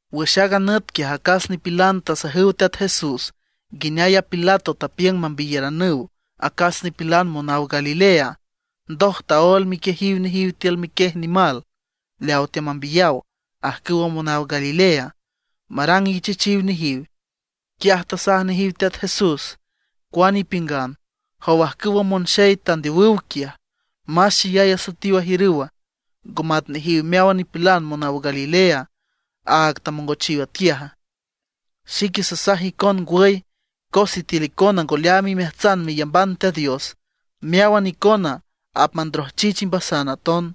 Wüx aaga nüt quiaj acas nipilan tasajüw Teat Jesús nguineay a Pilato tapiüng mambiyaranüw acas nipilan monaw Galilea, ndoj taól miquiejiw nejiw tiül miquiej nimal leaw teamambiyaw ajcüw monaw Galilea, marang ichechiw nejiw. Quiaj tasaj nejiw Teat Jesús: ―Cuane ipiüngan ¿jow ajcüwa monxey tandeowüw quiaj, más xeyay asoetiw ajiürüwa, ngo mat nejiw meáwan nipilan monaw Galilea, áag tamongochiw atquiaja? Xique sasaj icon ngwüy, cos sitiül icona ngo leaam imeajtsan meyamban Teat Dios, meáwan icona apmandrojchich imbasan aton.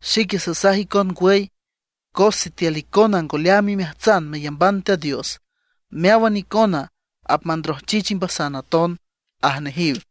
Xique sasaj icon ngwüy, cos sitiül icona ngo leaam imeajtsan meyamban Teat Dios, meáwan icona apmandrojchich imbasan aton ―aj nejiw.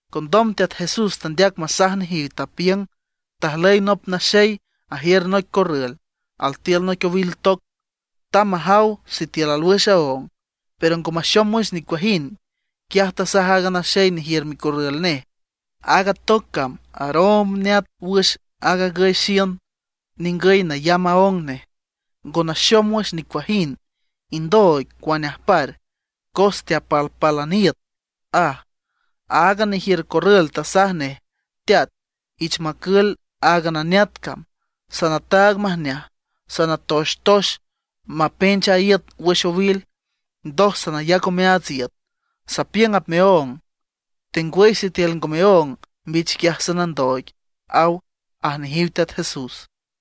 Condom Teat Jesús tandeac masaj nejiw, tapiüng: ―Tajlüy nop naxey ajiür noic corrül, altiül noic owil toc. Tamb majaw sitiül alwüx aóng, pero ngo maxom wüx nicuajind. Quiaj tasaj aaga naxey nejiür micorrül nej: “Aaga toc cam aroomb neat wüx aag agüy xiün ningüy nayamb aóng nej, ngo naxom wüx nicuajind. Indooig, cuane ajpar, cos teapalpálan iüt”, aj. Aaga nejiür corrül tasaj nej: “Teat, ich macül áagan a neat cam; sanataag majneaj, sanatoxtox mapench a iüt wüx owil, ndoj sanayac omeaats iüt. Sapiüng apmeóng, tengwüy sitiül ngo meóng, mbich quiaj sanandooig”, aw ―aj nejiw Teat Jesús.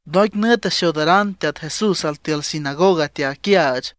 Noic nüt axoodaran Teat Jesús altiül sinagoga teaquiaach.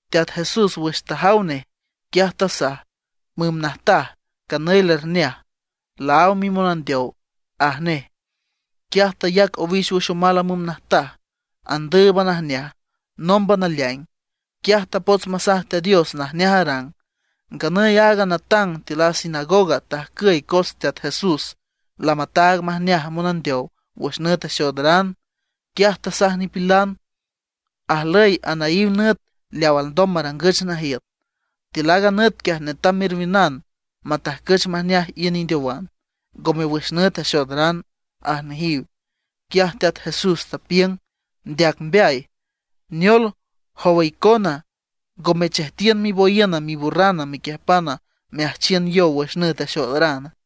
Teat Jesús wüx tajaw nej, quiaj tasaj: ―Müm najtaj, canüy lerneaj, laáw mimonandeow ―aj nej. Quiaj tayac owix wüx omal a müm najtaj, andǘüban ajneaj, nómban taleaing. Quiaj tapots masaj Teat Dios najneaj arang. Nganüy aaga natang tiül a sinagoga tajcüy cos Teat Jesús lamataag majneaj monandeow wüx nüt axoodaran. Quiaj tasaj nipilan: ―Ajlüy anaíw nüt leaw alndom marangüch najiüt. Tiül aaga nüt quiaj netam merwiünan matajcüch majneaj iün indeowan, ngome wüx nüt axoodaran ―aj nejiw. Quiaj Teat Jesús tapiüng: ―¡Ndeac mbeay! ¿Neol, jowa icona ngo mechejtiün miboyiüna miburrana mequiüjpan meajchiün yow wüx nüt axoodarana?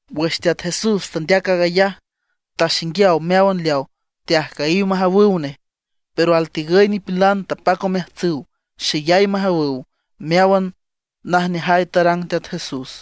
Wüx Teat Jesús tandeac aag ayaj taxinguiaw meáwan leaw teajcüyiw majawüw nej. Pero altigüy nipilan tapac omeajtsüw xeyay majawüw meáwan najneajay tarang Teat Jesús.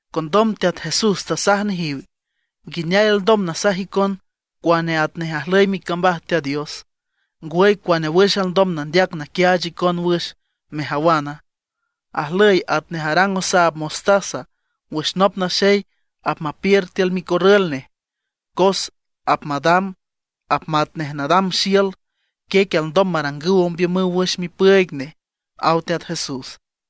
Condom Teat Jesús tasaj nejiw: ―¿Nguineay alndom nasaj icon cuane atnej ajlüy micambaj Teat Dios, ngwüy cuane wüx alndom nandeac naquiaach icon wüx, mejawana? Ajlüy atnej arang osaab mostaza wüx nop naxey apmapiür tiül micorrül nej. Cos apmadam apmatnej nadam xiül; quiec alndom marangüw ombiümüw wüx mipüüig nej ―aw Teat Jesús.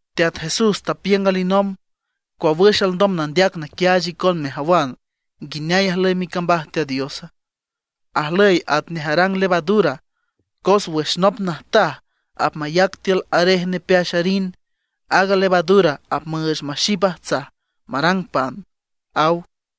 Teat Jesús tapiüng alinomb: ―¿Cua wüx alndom nandeac naquiaach icon mejawan nguineay ajlüy micambaj Teat Diosa? Ajlüy atnej arang levadura, cos wüx nop najtaj apmayac tiül arej nepeax arin, aaga levadura apmüüch maxip ajtsaj marang pan ―aw.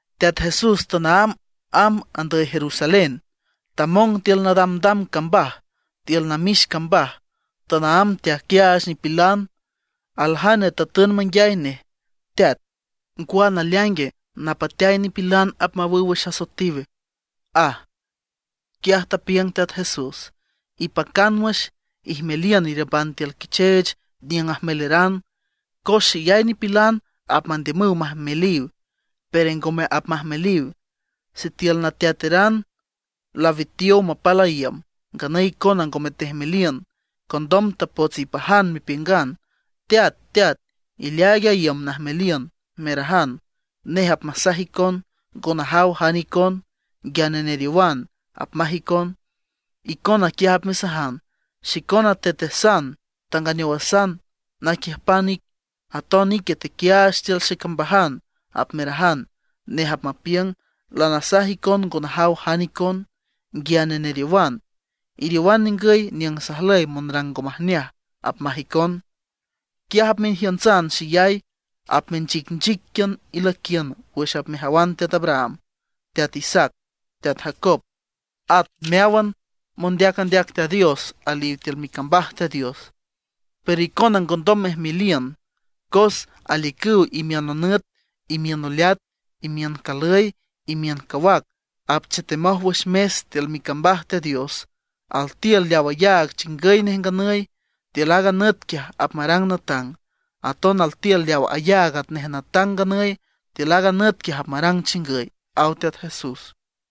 Teat Jesús tanaámb amb andüy Jerusalén. Tamong tiül nadamdam cambaj, tiül namix cambaj, tanaámb teaquiaach nipilan. Aljane tatün manguiay nej: ―Teat ¿ngwa naleaingue, napateay nipilan apmawüw wüx asoetiw? ―aj. Quiaj tapiüng Teat Jesús: ―Ipacan wüx, ijmeliün iriümban tiül quicheech niüng ajmeleran. Cos xeyay nipilan apmandiümüw majmeliw, pero ngome apmajmeliw. Sitiül nateateran lawitiow mapal a iüm, nganüy icona ngome tejmeliün, condom tapots ipajan mepiüngan: “Teat, teat, ileaaig a iüm najmeliün”, merajan. Nej apmasaj icon: “Ngo najaw jane icon, nguiane neriowan”, apmaj icon. Icona quiaj apmesajan: “Xicona tetesan, tanganeowasan naquiüjpan ic; aton ique tequiaach tiül xecambajan”, apmerajan. Nej apmapiüng: “Lanasaj icon ngo najaw jane icon, nguiane neriowan. Iriowan ningüy niüng sajlüy monrang ngo majneaj”, apmaj icon. Quiaj apmejiüntsan xeyay, apmenchicnchiquian ilüiquiün wüx apmejawan teat Abraham, teat Isaac, teat Jacob, at meáwan mondeac andeac Teat Dios aliw tiül micambaj Teat Dios; pero icona ngondom mejmeliün. Cos aliücüw imiün nonüt, imiün noleat, imiün calüy, imiün cawac; apchetemoj wüx mes tiül micambaj Teat Dios. Altiül leaw ayaag chingüy nej nganüy, tiül aaga nüt quiaj apmarang natang; aton altiül leaw ayaag atnej natang nganüy, tiül aaga nüt quiaj apmarang chingüy ―aw Teat Jesús.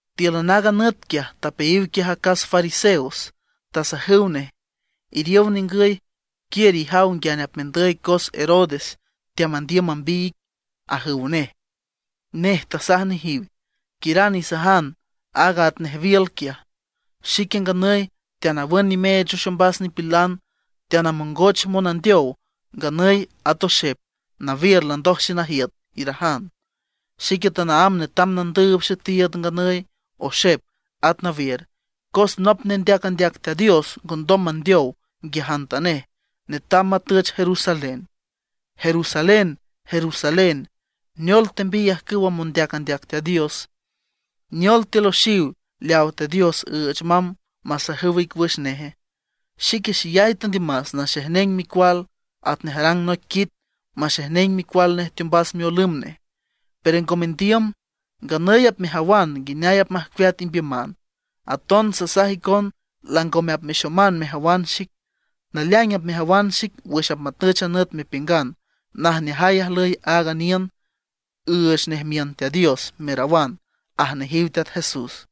Tíülan aaga nüt quiaj tapeayiw quiaj acas fariseos, tasajüw nej: ―Iriow ningüy, quiür ijaw nguiane apmendüy cos Herodes teamandiüm mambiy ic ―ajüw nej. Nej tasaj nejiw: ―Quiüran isajan aaga atnej wiül quiaj: “Xique nganüy teanawün nimeech wüx ombas nipilan, teanamongoch monandeow nganüy at oxep; nawiür landoj xenajiüt”, irajan. Xique tanaámb netam nandüüb xetiiüd nganüy, oxep, at nawiür, cos nop nendeac andeac Teat Dios ngondom mandeow nguiajantanej, netam matüch Jerusalén. ’¡Jerusalén, Jerusalén! ¿Neol tembiy ajcüwa mondeac andeac Teat Dios? ¿Neol teloxiw leaw Teat Dios üüch mamb masajüw ic wüx nej? ¡Xique xeyay tandiümas naxejneng micual, atnej arang noic quit maxejneng micual nej teombas miolümb nej, pero ngo mendiüm! Nganüy apmejawan nguineay apmajcueat imbiüman. Aton sasaj icon langome apmexoman mejawan xic; naleaing apmejawan xic wüx apmatüch a nüt mepiüngan: “Najneajay ajlüy aaga niün, üüch nej miün Teat Dios”, merawan ―aj nejiw Teat Jesús.